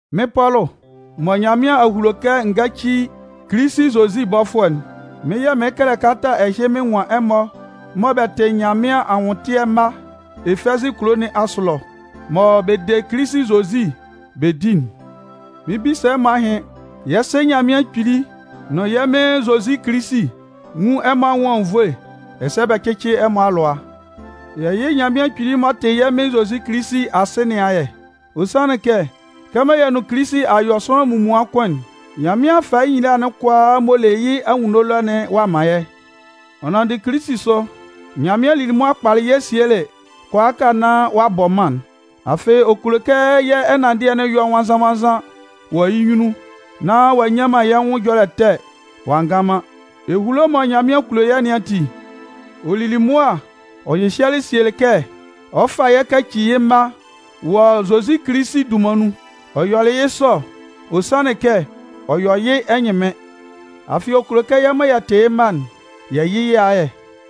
Mɩ́n Pɔlʋ, mɔ Nyanmɩan a hulo kɛ n gáci Kilisi Zozi bɔfʋɛ'n, mɩ́n yɛ̂ mɩɩn kɛlɛ kalata ɛhɩ mɩn nwan ɛmɔ mɔ bɛ tɩ Nyanmɩan anwʋntɩɛ mma [Efɛzɩ kulo nɩn asʋ ɛlɔ], mɔ bɛ de Kilisi Zozi bɛ di'n. Mɩn 'bisa ɛmɔ ahɩn. Yɛ́ Sɩ Nyanmɩan Kpili nʋn yɛ́ Mɩn Zozi Kilisi nwún ɛmɔ anwʋn anwunnvoe ɛsɛ bɛ cɩ́cɩ ɛmɔ alʋa. Yɛ yɩ́ Nyanmɩan Kpili m'ɔ tɩ yɛ́ Mɩn Zozi Kilisi Asɩ nɩn ayɛ. Ɔ sanlɩn kɛ kɛmɔ yɛ nʋn Kilisi a yɔ sʋanlan munmuan kʋn'n, Nyanmɩan a fa yɩ́ nyila'n kʋalaa m'ɔ le yɩ́ anwunno ɛlɔ'n ɔ'a man yɛ́. Ɔ nanndɩ Kilisi sʋ, Nyanmɩan lili mʋa kpalɩ yɛ́ sielɩ kʋalaaka nán ɔ'a bɔ mân'n. Afɩ ɔ kulo kɛ yɛ́ ɛnanndɩɛ'n yɔ nwannzan-nwannzan wɔ yɩ́ nyunnun nán ɔ'a nyan man yɛ́ nwʋn ɛjɔlɛ ɛtɛ ɔ'a ngan man. Ehulo mɔ Nyanmɩan kulo yɛ́ nɩn ati, ɔ lili mʋa ɔ hyɩhyɛlɩ sielɩ kɛ ɔ 'fa yɛ́ kaci yɩ́ mma wɔ Zozi Kilisi dunman nun. Ɔ yɔlɩ yɩ́ sɔ, ɔ sanlɩn kɛ ɔ yɔ yɩ́ ɛnyɩnmɩn. Afɩ, ɔ kulo kɛ yɛ́ mɔ yɛ tɩ yɩ́ mma'n, yɛ yɩ yɩ́ ayɛ,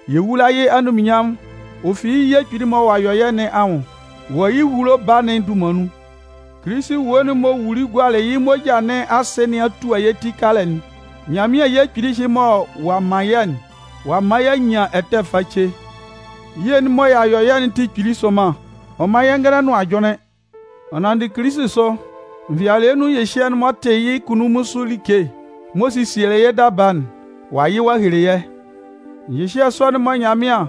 yɛ wula yɩ́ anunminnyanmʋn ɔ fi yɩ́ ye kpili'n mɔ ɔ'a yɔ yɛ́ nɩn anwʋn wɔ yɩ́ ehulo Baa'n dunman nun. Kilisi ewue'n m'ɔ wuli gualɩ yɩ́ moja nɩn asɩ nɩn a tua yɛ́ ti kalɛ'n. Nyanmɩan ye kpili ɛhɩ mɔ ɔ'a man yɛ́'n, ɔ'a man y'a nyan ɛtɛ face. Ye sɔ'n mɔ ɔ'a yɔ yɛ'n tɩ kpili sʋnman. Ɔ man yɛ́ ngɛlɛ nʋn ajʋnlɩn. Ɔ nanndɩ Kilisi asʋ, nvɩalɩɛ nun ɛhyɩhyɛ'n m'ɔ tɩ yɩ́ kunnun sʋ like, m'ɔ sesielɩ yɩ́ daba'n, ɔ'a yɩ ɔ'a hele yɛ́. Ɛhyɩhyɛ sɔ'n mɔ Nyanmɩan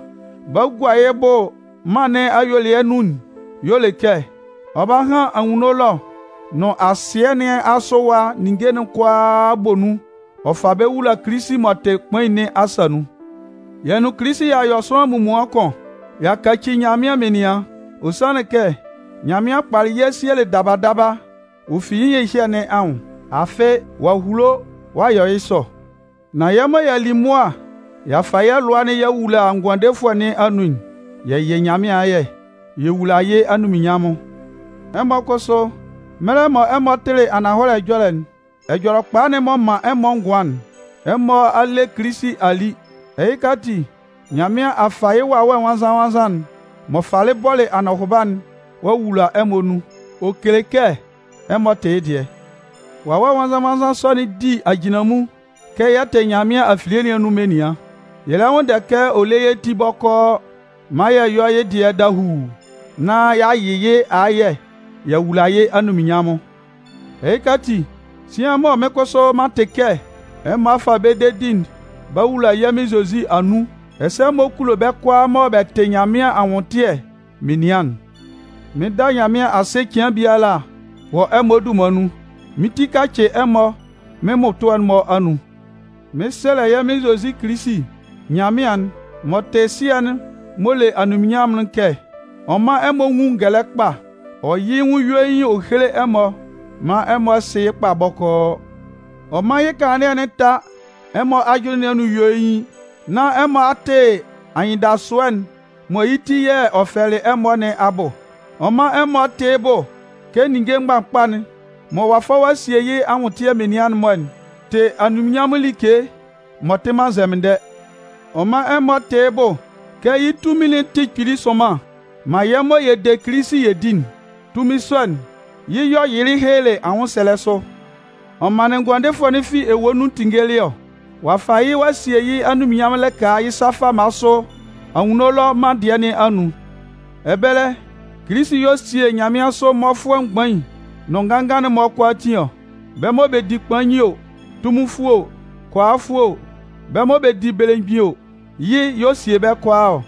'ba gua yɩ́ bʋ mân nɩn ayuelɩɛ nun'n y'ɔ le kɛ ɔ 'ba han anwunno ɛlɔ nʋn asɩɛ nɩn asʋ ɛwa ninnge'n kʋalaatin bɔ nun ɔ fa bɛ́ wula Kilisi m'ɔ tɩ kpain nɩn asa nun. Yɛ nʋn Kilisi y'a yɔ sʋanlan munmuan kʋn. Y'a kaci Nyanmɩan menian. Ɔ sanlɩn kɛ Nyanmɩan kpalɩ yɛ́ sielɩ daba daba ɔ fi yɩ́ ɛhyɩhyɛ nɩn anwʋn. Afɩ, ɔ'a hulo ɔ'a yɔ yɩ́ sɔ, nán yɛ́ mɔ y'a li mʋa y'a fa yɛ́ lʋa'n y'a wula Ngʋandefʋɛ nɩn anun'n, yɛ yɩ Nyanmɩan ayɛ, yɛ wula yɩ́ anunminnyanmʋn. Ɛmɔ kʋsʋ, mɛlɛ mɔ ɛmɔ tɩlɩ ananhɔlɛ ɛjɔlɛ'n, Ɛjɔlɛkpa'n m'ɔ man ɛmɔ ngʋan'n, ɛmɔ a le Kilisi a li. Ɛhɩka ati, Nyanmɩan a fa yɩ́ Wawɛ nwannzan-nwannzan'n m'ɔ falɩ bɔlɩ anɔhʋba'n ɔ'a wula ɛmɔ nun. Ɔ kele kɛ ɛmɔ tɩ yɩ́ dɩɛ. Wawɛ Nwannzan-nwannzan sɔ'n di ajinlanmun kɛ yɛ tɩ Nyanmɩan afilie nɩn anun menian. Yɛ lɛ nwʋnndɛ kɛ ɔ lé yɛ́ ti bɔkɔɔ maan yɛ yɔ́ yɩ́ dɩɛ dahuu nán y'a yɩ yɩ́ ayɛ y'a wula yɩ́ anunminnyanmʋn. Ɛhɩka ati, sian mɔ mɩ́n kʋsʋ m'an tɩ kɛ ɛmɔ a fa bɛ́ dedi'n b'a wula yɛ́ Mɩn Zozi anun, ɛsɛ ɛmɔ kulo bɛ́ kʋalaa mɔ bɛ tɩ Nyanmɩan anwʋntɩɛ menian'n, mɩn da Nyanmɩan asɩ cɩan biala wɔ ɛmɔ dunman nun. Mɩ́n ti kacɩ ɛmɔ mɩ́n mmʋtʋɛ'n-mɔ anun mɩn sɛlɛ yɛ́ Mɩn Zozi Kilisi Nyanmɩan'n, m'ɔ tɩ Sɩɛ'n m'ɔ le anunminnyanmʋn'n kɛ ɔ mán ɛmɔ nwún ngɛlɛ kpa, ɔ yɩ́ yɩ́ nwʋn yuein ɔ héle ɛmɔ maan ɛmɔ sɩ́ yɩ́ kpa bɔkɔɔ. Ɔ mán yɩ́ kanlannɩɛ'n tá ɛmɔ ajʋnlɩn nɩn anun yuein nán ɛmɔ a tɩ anyɩndasʋɛ'n mɔ yɩ́ ti yɛ̂ ɔ fɛlɛlɩ ɛmɔ nɩn abʋ. Ɔ mán ɛmɔ tɩ yɩ́ bʋ kɛ ninnge mgbakpa'n mɔ ɔ'a fa ɔ'a sie yɩ́ anwʋntɩɛ menian'n-mɔ'n tɩ anunminnyanmʋn like m'ɔ tɩ man nzɛmɩndɛ. Ɔ mán ɛmɔ tɩ́ yɩ́ bʋ kɛ yɩ́ tunmin'n tɩ kpili sʋnman man yɛ́ mɔ yɛ de Kilisi yɛ di'n. Tunmin sɔ'n, yɩ́ yɛ̂ ɔ yɩlɩ helelɩ anwʋnsɛlɛ sʋ ɔ manlɩn Ngʋandefʋɛ'n fi ewue nɩn anun tinngelɩ ɔ. Ɔ'a fa yɩ́ ɔ'a sie yɩ́ anunminnyanmʋn lɩka yɩ́ sa fama sʋ anwunno ɛlɔ mân dɩɛ nɩn anun. Ɛbɛlɛ, Kilisi y'ɔ sie nyanmɩansʋ mmɔfʋɛ mgbain nʋn nganngan'n-mɔ kʋalaatin ɔ. Bɛ́ mɔ bɛ di kpain o, tunminfʋɛ o, kʋalafʋɛ o, bɛ́ mɔ bɛ di belemgbin o, yɩ́ y'ɔ sie bɛ́ kʋalaa ɔ.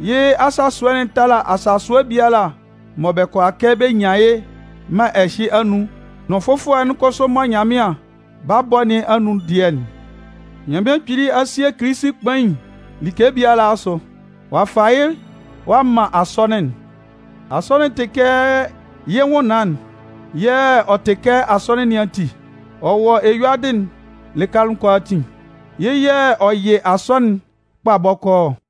Yɩ́ asasʋɛ'n tala asasʋɛ biala mɔ bɛ kʋala kɛ bɛ nyan yɩ́ mân ɛhɩ anun nʋn fʋfɔlɛ'n kʋsʋ mɔ Nyanmɩan 'ba bɔ nɩn anun dɩɛ'n. Nyanmɩan Kpili a sie Kilisi kpain like biala asʋ. Ɔ'a fa yɩ́ a man Asɔnɩn'n. Asɔnɩn'n tɩ kɛ yɩ́ nwʋnnaan yɛ̂ ɔ tɩ kɛ Asɔnɩn nɩn ati. Ɔ wɔ eyuadɩ'n lɩka kʋalaatin. Yɩ́ yɛ̂ ɔ yɩ Asɔnɩn'n kpa bɔkɔɔ ɔ.